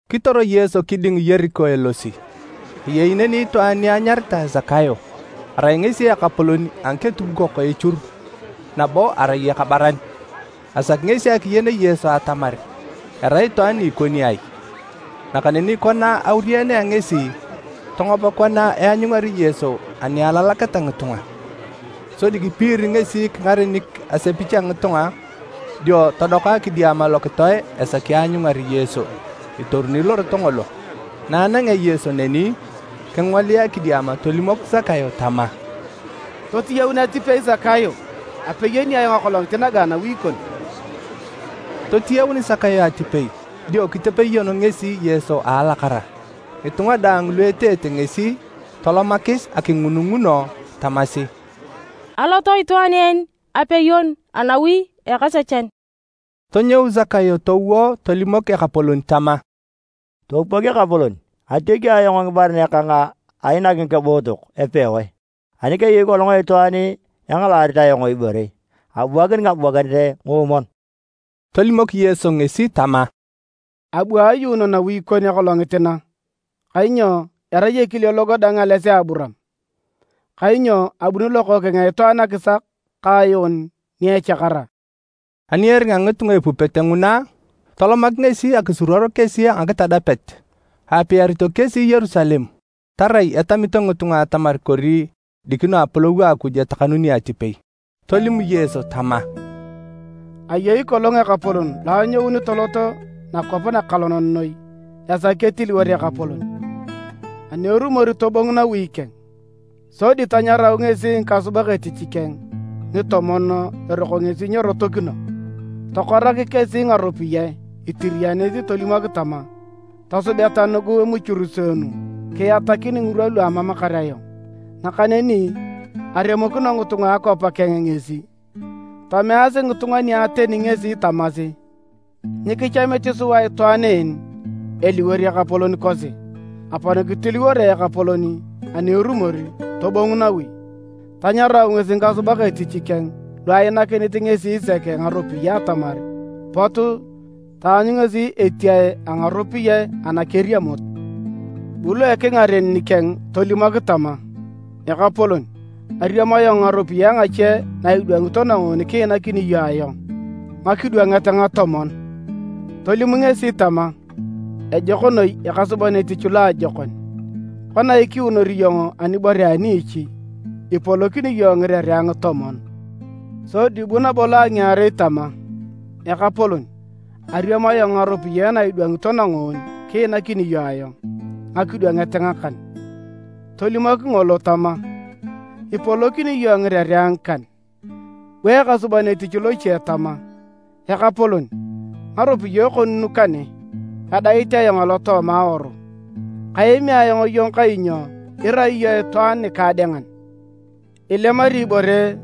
Kitor Yesu kiding Yeriko elosi. Ayei neni itwaan ni anyaritae Sakayo, arai ngesi ekapolon a ngiketubukok echur nabo arai ekabaran. Asaki ngesi akiyen Yesu atamar erai itwaan ni ikoni ai, nakaneni kona aurianea ngesi, tongop kona eanyungari Yesu ani alalaketa ngitunga. Sodi kipiiri ngesi kingarenik asepich a ngitunga dio todoka kidiama lokitoe esaki aanyungar Yesu itoruni lorot ngolo. Na anangea Yesu neni, kingolia kidiama tolimok Sakayo tama, “Totiyaun atipei Sakayo, apeyoni ayong akolongit naga anawi kon.” Totiyaun Sakayo atipei dio kitepeyon ngesi Yesu a alakara. Ngitunga daang lu eteete ngesi, tolomakis akingununguno tamasi, “Alot itwaan en apeyon anawi a ekasechan!” Tonyou Sakayo towo tolimok Ekapolon tama, “Topupok Ekapolon! Atiaki ayong ngibaren kang ainak ngikebootok epewae, ani keyei kolong itwaan engalaarit ayong ibore, abuakini ngabuakinet ngoomwon.” Tolimok Yesu ngesi tama, “Abu ayuuno nawi nakon akolongit na, kainyo erai ekile logo dang ales a Aburaam. Kainyo abuni Lokookeng a Itwaan akisak ka ayuun ni echakara.” Ani eringa ngitunga epupete nguna, tolomak ngesi akisuruor kesi a ngakitadapet. Aapiarito kesi Yerusalem tarai etamito ngitunga atamar kori dikino Apolou a Akuj etakanuni atipei. Tolim Yesu tama, “Ayei kolong ekapolon lo anyouni tolot nakwap nakalonan noi esaki ketiliwor ekapolon, ani erumor tobongu nawi keng. Sodi tanyarau ngesi ngikasubak etich keng ngitomon eroko ngesi nyerotokino, tokorak kesi ngaropiyae itiriyanit tolimok tama, ‘Tosubeta nugu emuchuruseenu kiatakin ngirwa lu amamakar ayong.’ Nakaneni aremokino ngitunga a akwap keng ngesi, tomeasi ngitunga nia ateni ngesi tamasi, ‘Nyikichamit sua itwaan en eliwor ekapolon kosi.’ “Apon kitiliworoe ekapolon ani erumor tobongu nawi. Tanyarau ngesi ngikasubak etich keng lu ainakinit ngesi sek ngaropiyae atamar pot taanyu ngesi etiae a ngaropiyae anakeriamut. Bu lo ekingaren nikeng tolimok tama, ‘Ekapolon, ariam ayong ngaropiyae ngache na idwangito nangoon kiinakini iyong ayong ngakidwanget ngatomon’. Tolim ngesi tama, ‘Ejok noi ekasuban etich loajokon! Kona ikiunor iyong anibore a niichi, ipolokini iyong ngirerea ngitomon.’ Sodi bu nabo lo a ngiarei tama, ‘Ekapolon, ariam ayong ngaropiyae na idwangito nangoon kiinakini iyong ayong ngakidwanget ngakan.’ Tolimok ngolo tama, ‘Ipolokini iyong ngirerea ngikan.’ Bu ekasuban etich loche tama, ‘Ekapolon, ngaropiyae kon nu kane, edait ayong alotooma awaru. Kaemi ayong iyong kainyo irai iyong itwaan nikaadengan. Ilemari ibore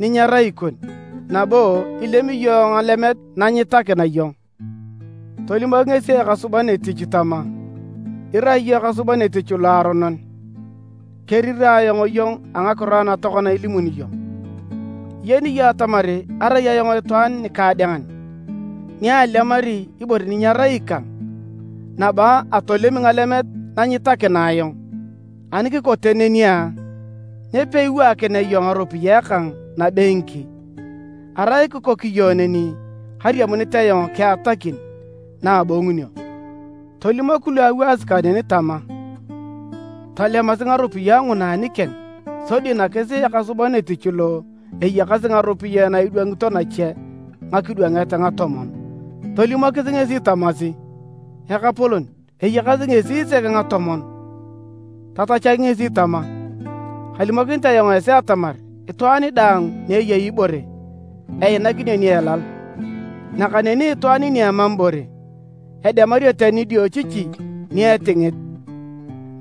ni nyerai ikon, nabo ilemi iyong ngalemet na nyitakina iyong.’ Tolimok ngesi ekasuban etich tama, ‘Irai iyong ekasuban etich loaronon! Kerirae ayong iyong a ngakiro ana tokona ilimuni iyong!’ Iyeni iyong atamar arai ayong itwaan nikaadengan ni alemari ibore ni nyerai ikang, nabo atolemi ngalemet na nyitakina ayong. Ani kikote neni a, nyo peiwaakinea iyong ngaropiyae kang nabengki? Arai kikok iyong neni kariamunit ayong kiatakin na abongunio. Tolimok lu awaasi kaneni tama, ‘Tolemasi ngaropiyae nguna anikeng sodi nakis ekasuban etich lo eyakasi ngaropiyae na idwangito nache ngakidwanget ngatomon.’ Tolimokis ngesi tamasi, ‘Ekapolon, eyakasi ngesi sek ngatomon!’ Tatachak ngesi tama, ‘Kalimokinit ayong esi atamar itwaan daang ni eyei ibore, einakinio ni elal. Nakaneni itwaan ni emam ibore, edemario tani nidiochichi ni etingit!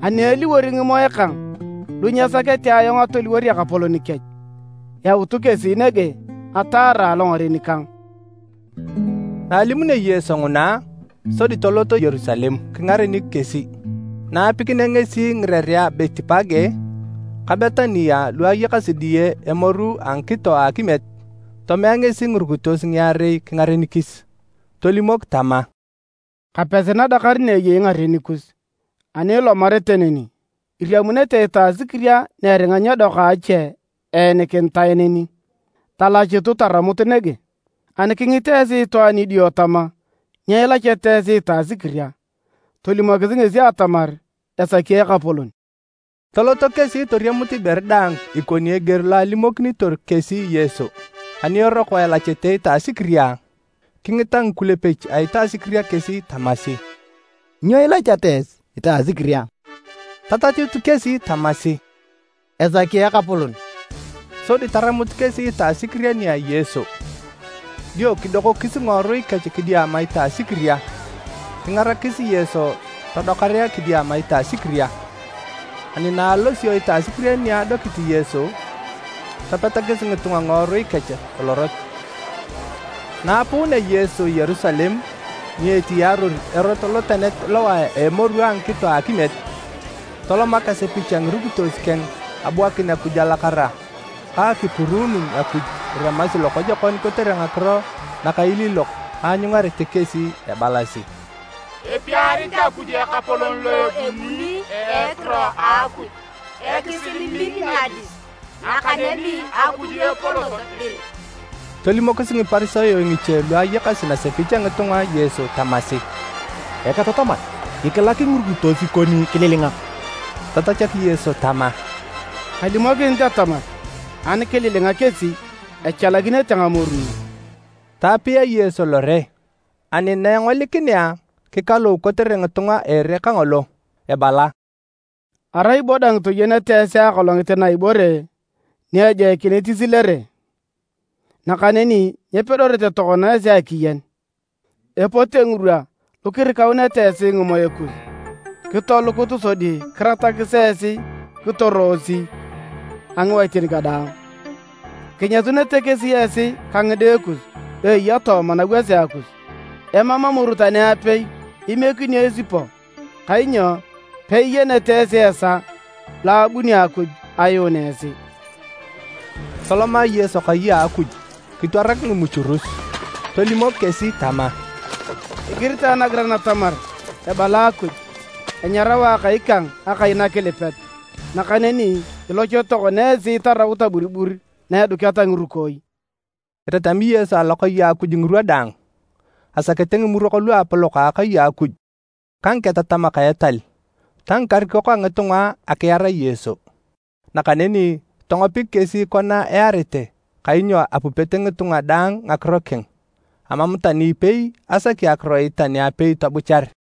Ani eliwor ngimoe kang lu nyesakete ayong atoliwor ekapolon kech, yautu kesi nege ataara alongaren kang!’” Na alimunio Yesu nguna, sodi tolot Yerusalem kingarenik kesi. Na apikinea ngesi ngirerea a Betipage ka Betania lu ayakasi diye emoru a ngikito a akimiet, tomea ngesi ngirukitos ngiarei kingarenikis. Tolimok tama, “Kapesi nadakar na eyei ngaren kus, ani ilomarete neni, iriamunete itasikiria ni eringa nyedoka a ache eenikinitae neni. Talachutu taramut nege. Ani kingit esi itwaan idio tama, ‘Nyo ilacheta esi itasikiria?’ Tolimokisi ngesi atamar esaki Ekapolon.” Toloto kesi toriamut ibore daang ikoni eger lo alimokinitor kesi Yesu. Ani eroko elachete itasikiria, kingita ngikulepek a itasikiria kesi tamasi, “Nyo ilacheta esi itasikiria?” Tatachut kesi tamasi, “Esaki Ekapolon”, sodi taramut kesi itasikiria nia Yesu. Dio kidokokis ngiworui kech kidiama itasikiria, kingarakis Yesu todokarea kidiama itasikiria. Ani na alosio itasikiria ni adokit Yesu, topetakis ngitunga ngiworui kech lorot. Na aapuunea Yesu Yerusalem ni etiyaaror erot lotenet lowae a emoru a ngikito a akimiet, tolomak asepich a ngirukitos keng abuakin Akuj alakara ka akipuruun Akuj iremasi lokojokon kotere ngakiro nakailiilok aanyungarete kesi ebalasi: “Epiarit Akuj Ekapolon lo ebuni a ekiro a Akuj! Ekisil min nadis, nakaneni Akuj epolot dir!” Tolimokis Ngiparisayo ngiche lu ayakasi nasepich a ngitunga Yesu tamasi, “Eketataman, kikilak ngirukitos kon kililinga!” Tatachak Yesu tama, “Kalimokinit atamar, ani kililinga kesi, echalakinete ngamoru nu.” Taapia Yesu lore, ani na engolikinea, kikalou kotere ngitunga a ere kangolo, ebala, “Arai bo dang toyenete esi akolongit na ibore ni ejoikinit isilere! Nakaneni nyipedorete tokona esi akiyen! Epote ngirwa lu kirikauneta esi ngimoe kus kitolukut sodi kiratakis esi kitoroosi a ngiwaitin kadaang. Kinyasunete kesi esi ka ngide kus lu eya tooma nawasea kus, emam amoru tani apei imiekinio esipo, kainyo peiyenete esi esaa lo abunio Akuj ayuun esi!” Toloma Yesu kai a Akuj kitwarak ngimuchurus, tolimok kesi tama, “Igiritae nagiran atamar ebala Akuj, ‘Enyarao Akai kang Akai nakilipet.’ Nakaneni iloch tokona esi itaraut aburibur na eduketa ngirukooi!” Etatami Yesu alokai a Akuj ngirwa daang. Asakete Ngimurok luapolok a akai a Akuj ka ngiketatamak a etal, ta ngikarikok a ngitunga akiar Yesu, nakaneni tongopik kesi kona earete kainyo apupete ngitunga daang ngakiro keng, amam tani ipei asaki akiroit tani apei tobuchar.